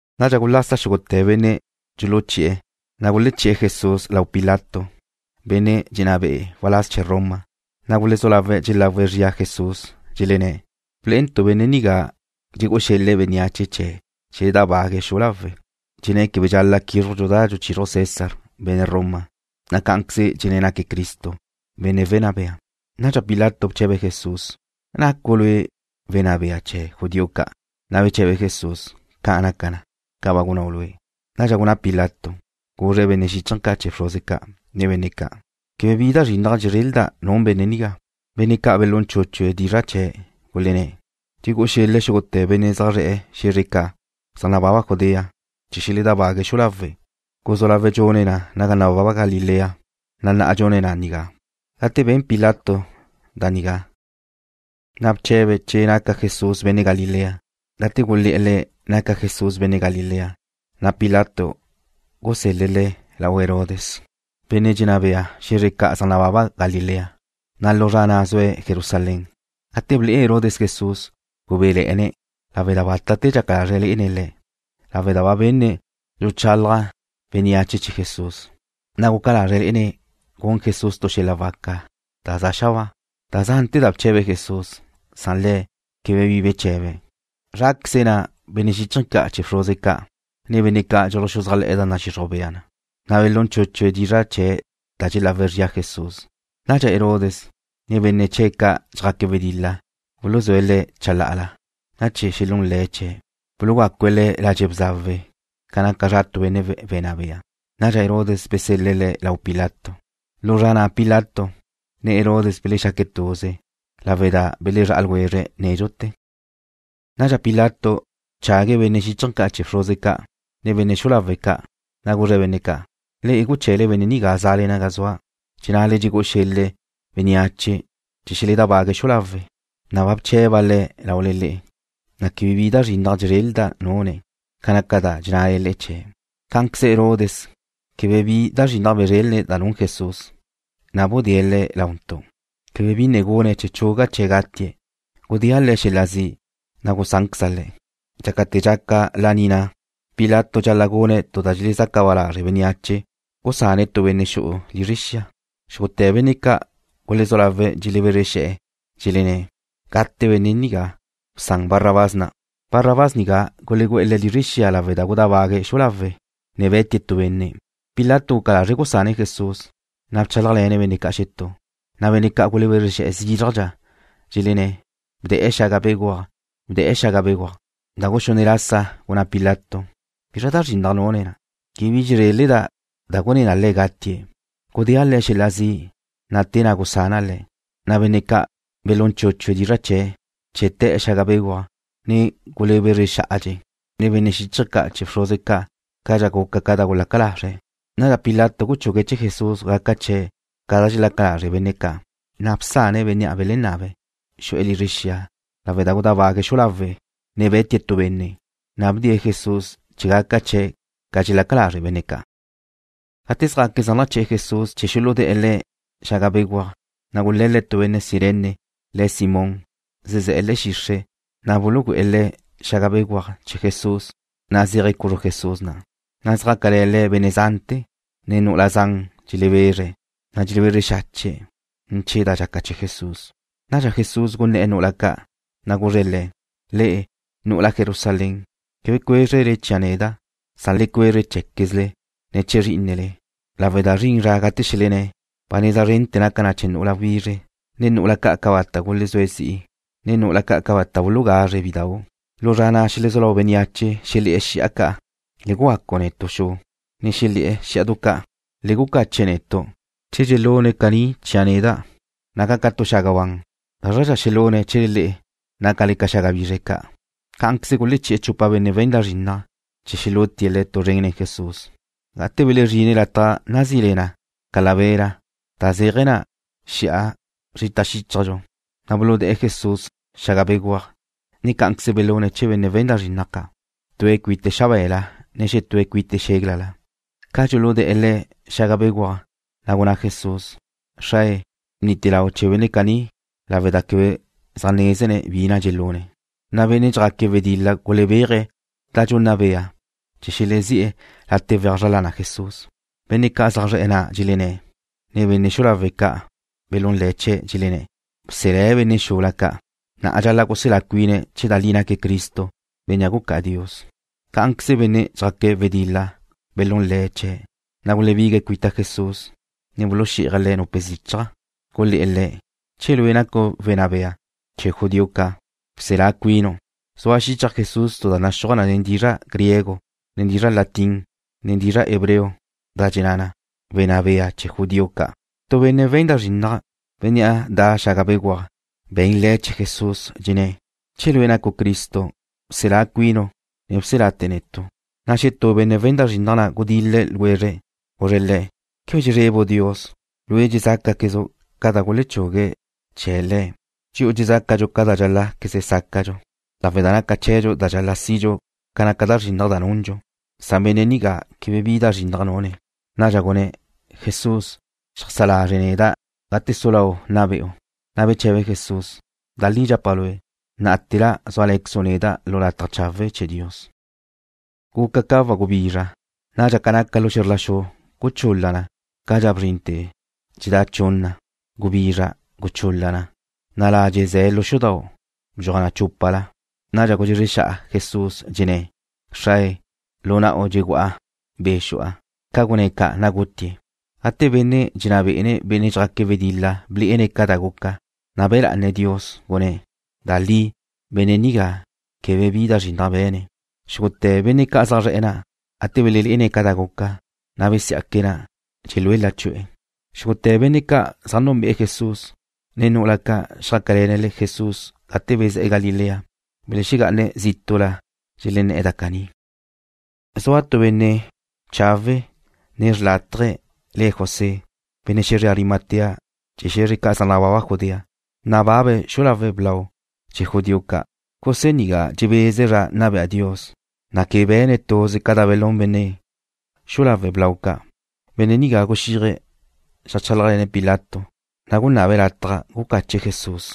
Nadxa gulasa xúgute̱ benne' dxuluchi'e̱, na' guleché̱'e̱ Jesús lau Pilato, benne' dxenná be'e̱ waláz chee̱ Roma. Na' gulezú lawe̱' dxelagu zrie̱' Jesús, dxelenné̱': ―Ble'entu' benne' nigá dxegú'u xel-le̱' bénneache chee̱ xeledábague̱' xu'u lawe'. Dxenné̱' quebe dxal-la' quízrujntu' da dxuchizruj César, benne' Roma, na' cá'anqueze dxenné̱' naque̱' Cristo, Benne' Wenná Bea. Nadxa Pilato bche̱be̱' Jesús: ―¿Nacu' Lue' Wenná Bea chee̱ judío ca'? Na' beche̱be Jesús: ―Ca' naca na, ca ba gunnáu' lue'. Nadxa gunná Pilato, guzre̱' benne' xíchaje̱ ca' chee̱ bxruze ca', ne bénneache ca': ―Quebe bi da zrinnaj dxezrelda' nun benne' nigá. Benne' ca' belún chúchue̱' dizra' chee̱', gulenné̱': ―Dxegu'u xel-le̱' xúgute̱ benne' zaj zre̱'e̱ xe̱zre ca' zaj nababa Judea chee̱ xeledábague̱' xu'u lawe'. Guzú lawe̱' dxune̱' na naga nababa Galilea, na' na'a dxune̱' na nigá. Gate ben Pilato da nigá, na' bche̱be̱' che naca Jesús benne' Galilea. Gate gulé̱'e̱ le̱' naca Jesús benne' Galilea, na' Pilato gusél-le̱' Le̱' lau Herodes, benne' dxenná be'e̱ xe̱zre ca' zaj nababa Galilea, na' lu zra na' zue̱' Jerusalén. Gate ble'e Herodes Jesús, gubéle̱'e̱ne̱', lawe' da bátate̱ dxaca lazre̱' lé'ene̱' Le̱', lawe' da ba benne̱' dxuluchalaj bénneache chee̱ Jesús, na' guca lazre̱' lé'ene̱' gun Jesús tu xel-la waca da za xabáa. Da zante̱ da bche̱be̱' Jesús, na' Le̱' quebe bi beche̱be̱'. Zráqueze benne' xíchaje̱ ca' chee̱ bxruze ca' na', nen benne' ca' dxuluxuzájle̱'e̱ da nadxixruj bea na, na' belún chúchue̱' dizra' chee̱' da dxelagu zria Jesús. Nadxa Herodes, ne benne' chee̱' ca' dxjaque̱' wedil-la buluzúe̱' Le̱' chalá'ala, na' chee̱ xelún le̱' chee̱', bulugácue̱' Le̱' ladxe' bzawe ca naca zra tu benne' wenná bea. Nadxa Herodes besel-le̱' Le̱' lau Pilato. Lu zra na' Pilato, ne Herodes belexaque̱' tuze, lawe' da belezrá'a ljwezre̱' nédxute̱. Nadxa Pilato bchague̱' benne' xíchaje̱ ca' chee̱ bxruze ca', ne benne' xu'u lawe' ca', na' guzre̱' benne' ca': ―Le'e guche̱le benne' nigá za'le naga zua', dxennale dxegú'u xel-le̱' bénneache chee̱ xeledábague̱' xu'u lawe'. Neda' ba bche̱ba' Le̱' laule le'e, na' quebe bi da zrinnaj dxezréleda' nune̱' ca naca da dxennale chee̱'. Cá'anqueze Herodes quebe bi da zrinnaj bzrélene̱' da nun Jesús, na' budée̱' Le̱' launtu'. Quebe bi ne gune̱' chee̱ chuga' chee̱' gatie̱'. Gudéa' Le̱' xel-la zi', na' gusánqueza' Le̱'. Dxácate̱ dxaca laní na', Pilato dxal-la' gune̱' tu da dxelezaca ba lazre' bénneache, gusane̱' tu benne' xu'e̱ lizre xia. Xúgute̱ benne' ca' gulezú lawe̱' dxelebezre xe̱'e̱, dxelenné̱': ―¡Gate benne' nigá! ¡Bsan Barrabás na'! Barrabás nigá gulegú'e̱ le̱' lizre xia lawe' da gudábague̱' xu'u lawe', na' be̱tie̱' tu benne'. Pilato guca lazre̱' gusane̱' Jesús, na' bchálajle̱ne̱' benne' ca' xetú. Na' benne' ca' gulebezre xe̱'e̱ zízrajdxa, dxelenné̱': ―¡Bde̱'e̱ xaga béguaj! ¡Bde̱'e̱ xaga béguaj! Da guxunne' lasa gunná Pilato: ―¿Bizra da zrinnaj nune̱'? Quebe bi dxezréleda' da gudé na Le̱' gatie̱'. Gudéa' Le̱' xel-la zi', na' te na' gusana' Le̱'. Na' benne' ca' belún chúchue̱' dizra' chee̱' chee̱ te̱'e̱ xaga béguaj, ne gulebezre xá'atie̱', nen benne' xíchaje̱ ca' chee̱ bxruze ca', cadxa guca ca da gulaca lazre̱'. Nadxa Pilato guchugue̱' chee̱ Jesús gaca chee̱' ca da dxelaca lazre' benne' ca'. Na' bsane̱' bénnea' belenabe̱', xu'e̱ lizre xia lawe' da gudábague̱' xu'u lawe', ne be̱tie̱' tu benne', na' bdee̱' Jesús chee̱ gaca chee̱' ca dxelaca lazre' benne' ca'. Gate zjaque̱' zaj naché̱'e̱ Jesús chee̱ xuludé̱'e̱ Le̱' xaga béguaj, na' gule̱le̱' tu benne' Cirene, le̱' Simón, zezé̱'e̱ le̱'e̱ xixre', na' bulugu'e̱ le̱' xaga béguaj chee̱ Jesús, na' zéaje̱' cuzru Jesús na'. Na' xjácale̱ Le̱' benne' zante̱, ne nu'ula zan dxelebezre̱', na' dxelebezre xache̱' ne̱ chee̱ da dxaca chee̱ Jesús. Nadxa Jesús gunné̱'e̱ nu'ula ca', na' guzre̱' le̱': ―Le'e, nu'ula Jerusalén, quebe cuézrele chia' neda'. Le cuezre cheé̱quezle, ne chee̱ zrí'inele, lawe' da zrin zra gate xelenné̱': “Ba neza zren naca na chee̱ nu'ula wizre, ne nu'ula ca' cabata' gulezúe̱' zi'i, ne nu'ula ca' cabata' bulugazre̱' bidau'.” Lu zra na' xelezú lau bénneache xelé̱'e̱ xi'a ca': “Le gugacu netu' xu.” Na' xelé̱'e̱ xí'adu ca': “Le gucache netu'.” Che dxelune̱' da caní chia' neda', naca' ca tu xaga ban, ¿gázradxa xelune̱' chee̱le le'e, nácale ca xaga bizre ca'? Cá'anqueze guleché̱'e̱ chupa benne' we̱n da zrinnaj chee̱ xelútie̱' le̱' tu zren nen Jesús. Gate belezrine̱' lataj na' nazí le na, Calavera, da zéaje̱ na, Xi'a Zrita Xíchajdxu, na' buludé̱'e̱ Jesús xaga béguaj, ne cá'anqueze belune̱' chee̱ benne' we̱n da zrinnaj ca', tue̱' cuite̱' xabe̱la, ne xetúe̱' cuite̱' xéglala. Ca dxuludé̱'e̱ Le̱' xaga béguaj, na' gunná Jesús: ―Xrae, bnite lau chee̱ benne' caní lawe' da quebe zaj nézene' bi na' dxelune'. Na' benne' dxjaque̱' wedil-la gulebeje̱' da dxunna bea' chee̱ xelezí'e̱ late' weaj zra lana Jesús. Benne' ca' zaj zre̱'e̱ na' dxelenné̱'e̱, ne benne' xu'u lawe' ca' belún le̱' chee̱', dxelenné̱': ―Bselé̱' benne' xula ca'. Na'a dxal-la' guselá cuine̱' che da li naque̱' Cristo, Bénnea' Gucá'a Dios. Cá'anqueze benne' dxjaque̱' wedil-la belún le̱' chee̱', na' gulebigue̱' cuita Jesús, ne buluxí'aje̱' Le̱' nupe zichaj. Gulé̱'e̱ Le̱': ―Che lue' nacu' Wenná Bea chee̱ judío ca', bselá cuinu'. Zua xichaj Jesús tu da naxúaj nen dizra' griego, ne dizra' latín, ne dizra' hebreo, da dxenná na: ―Wenná Bea chee̱ judío ca'. Tu benne' we̱n da zrinnaj, bénnea' de̱'e̱ xaga béguaj be̱n le̱' chee̱ Jesús, dxenné̱': ―Che Lue' nacu' Cristo, bselá cuinu', ne bselate̱ netu'. Na' xetú benne' we̱n da zrinnaj na' gudil-le̱' ljwezre̱'. Guzre̱' le̱': ―¿Quebe dxezrebu' Dios? Lue' dxezácaquezu' ca da gulechugue̱' chee̱' Le̱'. Dxi'u dxezácadxu ca da dxál-la'queze sácadxu, lawe' da dxaca chee̱dxu da dxal-la' sidxu ca naca da zrinnaj da nundxu, san benne' nigá quebe bi da zrinnaj nune̱'. Nadxa gunné̱': ―Jesús, xeajsá lazre' neda' gate su lau' nna be'u. Na' beche̱be Jesús: ―Da li dxapa' lue', ná'ate̱la súale̱quezu' neda' lu lataj chawe' chee̱ Dios. Guca ca wagubizra. Nadxa ca naca lu xe̱zr la xu guchul-la na cadxa bzrinte̱ na dxedá' chunna. Gubizra guchul-la na, na' ladxe' ze̱ lu xudau' bdxuaj na chúpala. Nadxa gudxezre xa'a Jesús, dxenné̱': ―Xrae, lu na'u dxegu'a be' xu'a. Ca gunné̱' ca', na' gutie̱'. Gate benne' dxenná bé'ene̱' benne' dxjaque̱' wedil-la blé'ene̱' ca da guca, na' be̱ lá'ane̱' Dios, gunné̱': ―Da li, benne' nigá quebe bi da zrinnaj be̱ne̱'. Xúgute̱ benne' ca' zaj zre̱'e̱ na', gate belelé'ene̱' ca da guca, na' besiá'que̱' na', dxelu'e̱ lachu'e̱. Xúgute̱ benne' ca' zaj núnbe'e̱ Jesús, ne nu'ula ca' xjácale̱ne̱' Jesús gate bezé̱'e̱ Galilea, belexegá'ane̱' zítu'la dxelenné̱'e̱ da caní. Zua tu benne' chawe' ne xrlátaje le̱' José, benne' xe̱zre Arimatea chee̱ xe̱zre ca' zaj nababa Judea. Nababe̱' xu'u lawe' blau chee̱ judío ca'. José nigá dxebeze̱' zra nna bea Dios, na' quebe be̱ne̱' tuze ca da belún benne' xu'u lawe' blau ca'. Benne' nigá guxíaje̱' xeajchálajle̱ne̱' Pilato, na' gunabe̱' latja gucache̱' Jesús.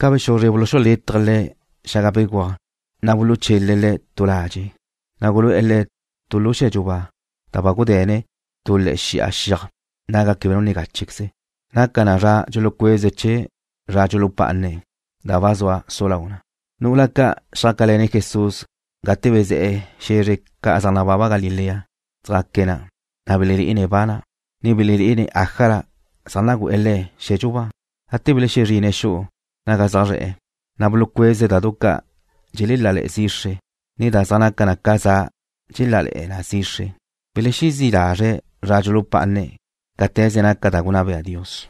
Ca bexuzre buluxulétaje̱' Le̱' xaga béguaj, na' buluxuchele̱' Le̱' tu ladxe', na' gulu'e̱ Le̱' tu lu xe̱dxu ba, da ba gude̱ne̱' tu le̱'e̱ xi'a xiaj, naga quebe nu ne gáchequeze. Naca na zra dxulucueze̱' chee̱ zra dxulupá'ane̱', da ba zua su lau na. Nu'ula ca' xjácale̱ne̱' Jesús gate bezé̱'e̱ xe̱zre ca' zaj nababa Galilea, xjaque̱' na', ne belelé'ene̱' ba na', ne belené̱'e̱ ájala zaj nagu'e̱ Le̱' xe̱dxu ba. Gate belexezrine̱' xu'u naga zaj zre̱'e̱, na' bulucueze̱' da du ca' dxelelále̱'e̱ zixre, ne da zaj naca na ca za dxelelále̱'e̱ na zixre. Belexezí' lazre̱' zra dxulupá'ane̱' cáte̱ze naca da gunná bea Dios.